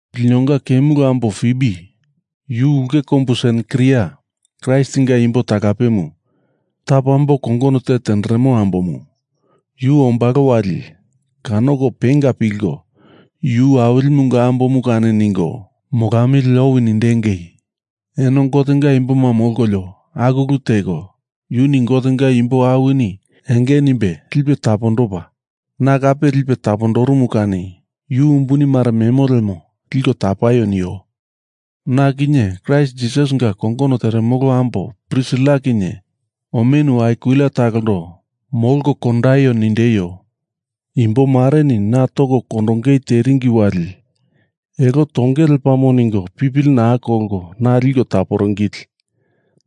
Linonga kemulu ambo Fibi, yu ulke kombu Senkria Kraistinga imbo talapemu tapo ambo kongono te tenderemo ambomu, yu ombalo wali kanoko penga pilko yu Awilimunga ambomu kani ningo molamili owi nindengei. Eno Gotenga imboma molkolio aku ulu teko, yuni Gotenga imbo awini enge nimbe lipe tapondopa, na kape lipe tapondorumu kani yu umbuni mare memo lemo liko tapaio nio. Na kinye Kraist Jisasinga kongono teremolo ambo Prisila kinye omenu Akwila talondo molko kondaio nindeio. Imbomareni na toko kondongei teringi wali elo tongei lepamo ningo pipili naa kolko na liko taporingili.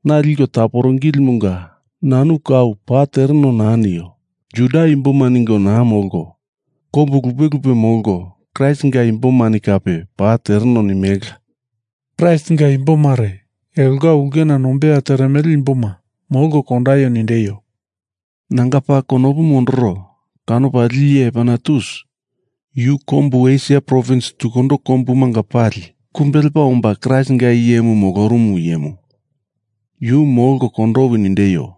Na liko taporingilimunga nanu kau paa tereno naa nio; Juda imboma ningo naa molko kombu lupe lupe molko Kraistinga imbomani kape paa tereno nimelela. Kraistinga imbo mare elonga ulkena nombeya teremele imboma molko kondaio nindeio. Nanga paa konopu mondoro kanopa lili iye Epainetus, yu kombu Esia provins tukundo kombumanga pali kumbe lepa omba Kraistinga iyemu molorumu iyemu, yu molko kondowi nindeio.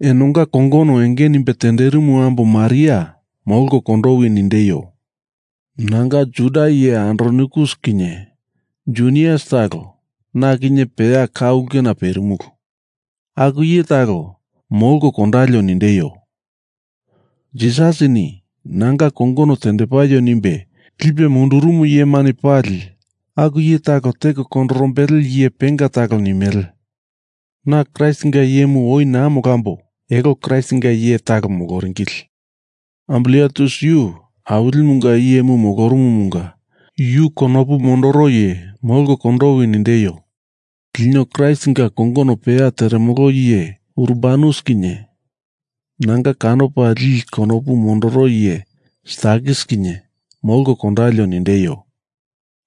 Enonga kongono enge nimbe tenderimu ambo Maria molko kondowi nindeio. Nanga Juda iye Andronikus kinye Junias talo, na kinye peya ka ulkena perimulu, aku iye talo molko kondalio nindeio. Jisasini nanga kongono tendepaio nimbe lipe mundurumu iyemani pali aku iye talo teko kondorombele iye penga talo nimele. Na Kraistinga iyemu oi naa molambo elo Kraistinga iye talo moloringili. Ampliatus yu Awilimunga iyemu moromomunga yu konopu mondoro iye molko kondowi nindeio. Lino Kraistinga kongono peya teremolo iye Urbanus kinye nanga kanopa lili konopu mondoro iye Stakis kinye molko kondalio nindeio.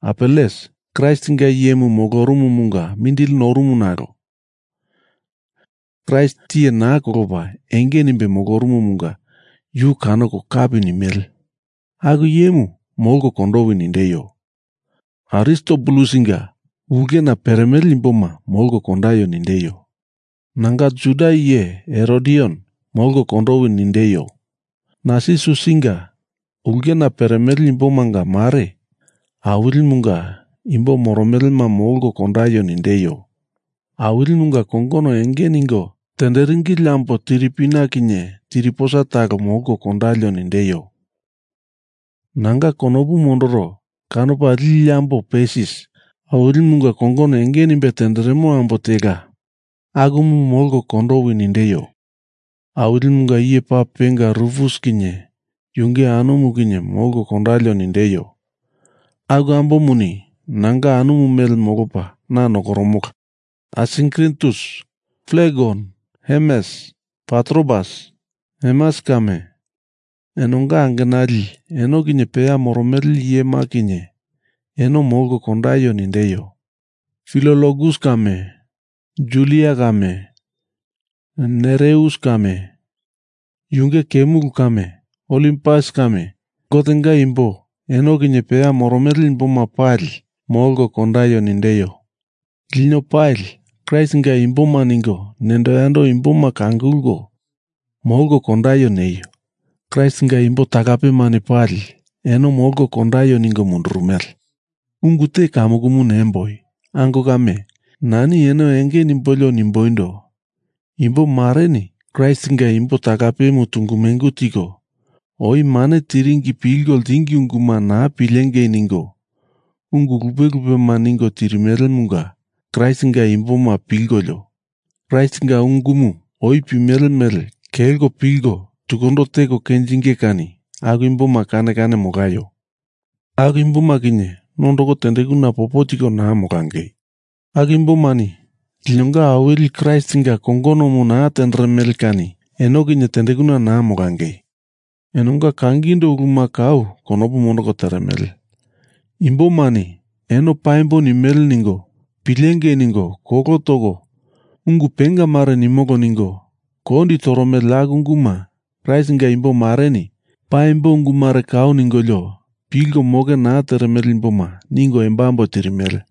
Apeles, Kraistinga iyemu molorumumunga mindili norumu nalo Kraist tiye naa kolopa enge nimbe ambolorumumunga yu kanoko kapi nimele, aku iyemu molko kondowi nindeio. Aristobulusinga ulkena peremele imboma molko kondaio nindeio. Nanga Juda iye Herodion molko kondowi nindeio. Narsisusinga ulkena peremele imbomanga mare Awilimunga imbo moromelema molko kondaio nindeio. Awilimunga kongono enge ningo tenderingili ambo Tiripina kinye Tiriposa talo molko kondalio nindeio. Nanga konopu mondoro kanopa lili ambo Persis, Awilimunga kongono enge nimbe tenderemo ambo tela, akumu molko kondowi nindeio. Awilimunga iye paa penga Rufus kinye yunge anumu kinye molko kondalio nindeio. Aku ambomuni nanga anumu mele molopa na nokoromola. Asinkritus, Flegon, Hermes, Patrobas, Hermas kame, enonga angenali eno kinye peya moromele iyema kinye eno molko kondaio nindeio. Filologus kame Julia kame Nereus kame yunge kemulu kame Olimpas kame Gotenga imbo eno kinye peya moromele imboma pali molko kondaio nindeio. Lino pali Kraistinga imboma ningo nendo yando imboma kangulko molko kondaio neio. Kraistinga imbo talapemani pali eno molko kondaio ningo mundurumele. Ungu te kamukumu nemboi. Ango kame, nani eno enge nimbolio nimboindo, Imbo mareni Kraistinga imbo talapemu tungu mengu tiko, oi mane tiringi pilko ltingi unguma naa pilengei ningo ungu lupe lupema ningo tirimelemunga Kraistinga imboma pilkolio, Kraistinga ungumu oi pimele mele kelko pilko tunduko teko kenjinge kani aku imboma kane kane molaio. Aku imboma kinye nondoko tendekuna popo tiko naa molangei. Aku imbomani linonga Awili Kraistinga kongonomu naa tenderemele kani eno kinye tendekuna naa molangei. Enonga kangindo uluma kau konopu mondoko teremele. Imbomani eno paimbo nimele ningo pilengei ningo kolo toko ungu penga mare nimolo ningo kondi toromele aku unguma Kraistinga imbo mareni, paimbo ungu mare kau ningolio pilko moke naa teremele imboma ningo embambo tirimele.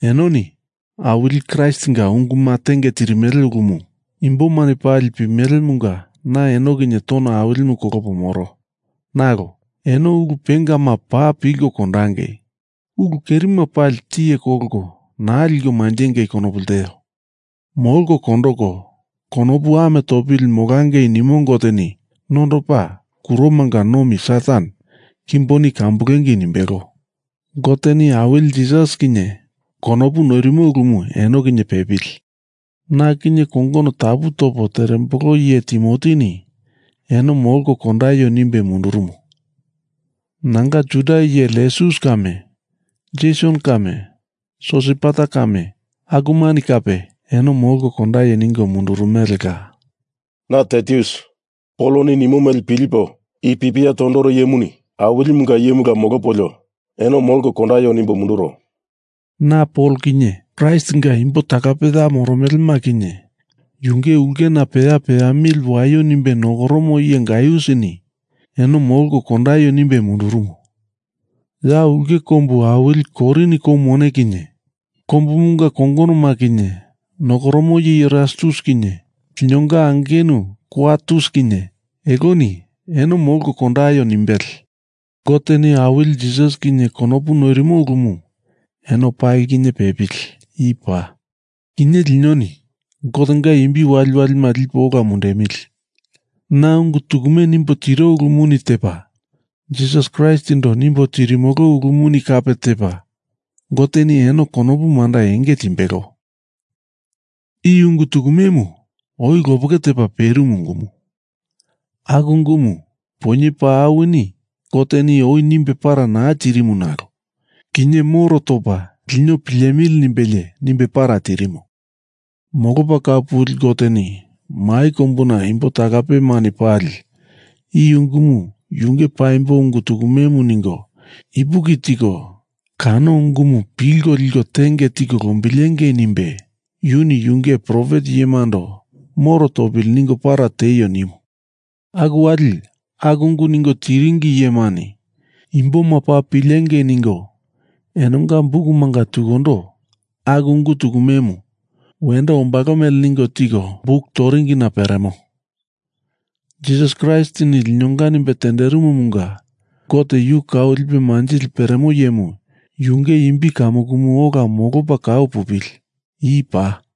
Enoni Awili Kraistinga unguma tenge tirimele ulumu imbomani pali pimelemunga na eno kinye tono awilimu kolopo moro, nalo eno ulu pengama paa pilko kondangei. Ulu kerima pali tiye kolko naa liko manjengei konopu lteo. Molko kondoko konopu ame topili molangei nimo Goteni nondopa kuromanga nomi Satan kimboni kambulengei nimbelo. Goteni Awili Jisas kinye konopu noirimo ulumu eno kinye pepili. Na kinye kongono tapu topo terembolo iye Timotini eno molko kondaio nimbe mundurumo. Nanga Juda iye Lusius kame Jeson kame Sosipater kame akumani kape eno molko kondaio ningo mundurumelela. Na Tertius, Poloni nimo mele pilipo i pipiamu tondoro iyemuni Awilimunga iyemula molopolio eno molko kondaio nimbo munduro. Na Pol kinye Kraistinga imbo talape ya moromelema kinye yunge ulkena peya peamili waio nimbe nokoromo iye Gaiusini eno molko kondaio nimbe mundurumo. Ya ulke kombu awili Korin kou mone kinye kombumunga kongonoma kinye nokoromo iye Erastus kinye linonga angenu Kwartus kinye eloni eno molko kondaio nimbele. Goteni Awili Jisas kinye konopu noirimo ulumu eno pali kinye pepili. I paa. Kinye linoni Gotenga imbi waliwalima lipo ola mundemili. Na ungu tukume nimbo tiro ulumuni tepa Jisas Kraistindo nimbo tirimolo ulumuni kape tepa Goteni eno konopu manda enge tindimbelo. I ungu tukumemu oi lopeke tepa perimu ungumu. Aku ungumu poinye paa awini Goteni oi nimbe para naa tirimu nalo kinye moro topa lino pilemili nimbelie nimbe para tirimo. Molopa Kau Puli Goteni mai kombuna imbo talapemani pali i ungumu yunge paimbo ungu tukumemu ningo ipuki tiko kano ungumu pilko liko tenge tiko lombilengei nimbe yuni yunge profet iyemando moro topili ningo para tieio nimu. Aku wali aku ungu ningo tiringi iyemani imboma paa pilengei ningo enonga bukumanga tukundo aku ungu tukumemu wendo ombalo mele ningo tiko buk toringina peremo. Jisas Kraistini linonga nimbe tenderimumunga Gote yu kau lipe manjili peremo iyemu, yunge imbi kamukumu ola molopa kau pupili. I paa.